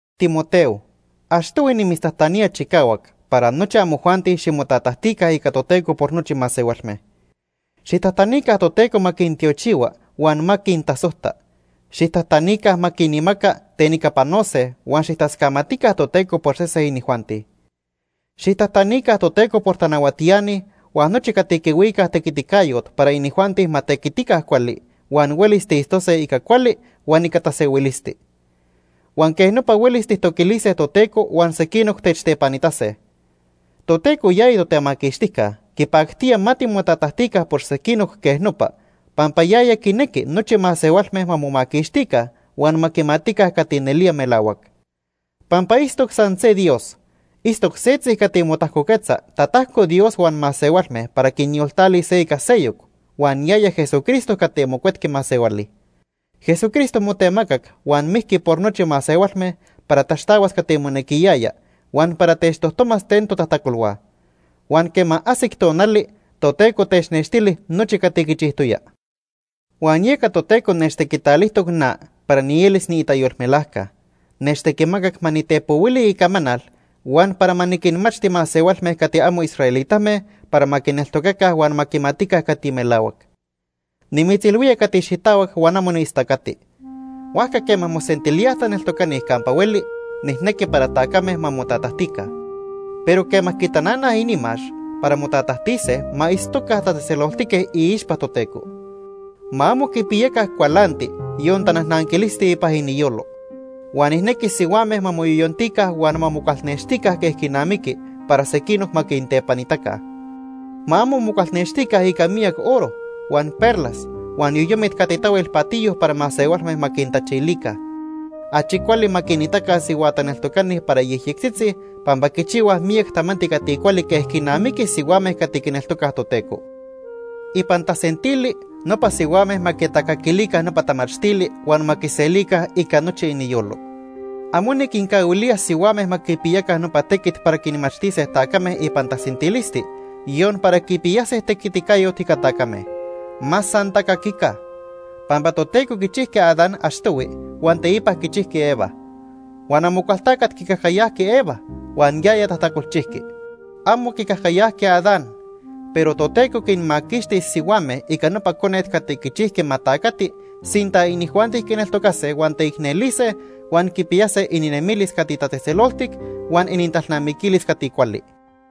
Timoteo, achtohui nimitztajtanía chicahuac para nochi amojuanti ximotatajtica ica Toteco por nochi masehualme. Xijtajtanica Toteco ma quintiochihua huan ma quintasojta. Xijtajtanica ma quinmaca ten ica panose huan xijtascamatica Toteco por sese inijuanti. Xijtajtanica Toteco por tanahuatiani huan nochi cati quihuicaj tequiticayot para inijuanti ma tequitica cuali huan huelis tiitztose ica cuali huan ica tasehuilisti. Huan quej nopa huelis tijtoquilise Toteco huan sequinoc techtepanitase. Toteco yaya Totemaquixtijca quipactía ma timotatajtica por sequinoc quej nopa, pampa yaya quinequi nochi masehualme ma momaquixtica huan ma quimatica cati nelía melahuac. Pampa itztoc san se Dios. Itztoc setzi cati motajcoquetza tatajco Dios huan masehualme para quinyoltalis se ica seyoc, huan yaya Jesucristo cati mocuetqui masehuali. Jesucristo motemacac huan mijqui por nochi masehualme para taxtahuas cati monequiyaya huan para techtojtomas ten totajtacolhua. Huan quema ajsic tonali Toteco technextili nochi cati quichijtoya. Huan yeca Toteco nechtequitalijtoc na para nielis niitayolmelajca. Nechtequimacac ma nitepohuili icamanal huan para ma niquinmachti masehualme cati amo israelitame para ma quineltocaca huan ma quimatica cati melahuac. Nimitzilhuía cati xitahuac huan amo niistacati. Huajca quema mosentilíaj taneltocani campa hueli, nijnequi para tacame ma motatajtica. Pero quema quitananaj inimax para motatajtise ma itztoca tatzejtzeloltique iixpa Toteco. Ma amo quipiyaca cualanti, yon tanajnanquilisti ipan iniyolo. Huan nijnequi sihuame ma moyoyontica huan ma mocualnextica quej quinamiqui para sequinoc ma quintepanitaca. Ma amo mocualnextica ica miyac oro, huan perlas, huan yoyomit cati tahuel patiyo para masehualme ma quintachilica. Achi cuali ma quinitaca sihua taneltocani para yejyectzitzi pampa quichihuaj miyac tamanti cati cuali quej quinamiqui sihuame cati quineltocaj Toteco. Ipan tasentili nopa sihuame ma quitacaquilica nopa tamachtili huan ma quiselica ica nochi iniyolo. Amo niquincahuilía sihuame ma quipiyaca nopa tequit para quinmachtise tacame ipan tasentilisti, yon para quipiyase tequiticayot ica tacame. Ma san tacaquica. Pampa Toteco quichijqui Adán achtohui huan teipa quichijqui Eva. Huan Amocualtacat quicajcayajqui Eva huan yaya tajtacolchijqui. Amo quicajcayajqui Adán. Pero Toteco quinmaquixtis sihuame ica nopa conet cati quichijqui ma tacati sinta inijuanti quineltocase huan teicnelise huan quipiyase ininemilis cati tatzejtzeloltic huan inintalnamiquilis cati cuali.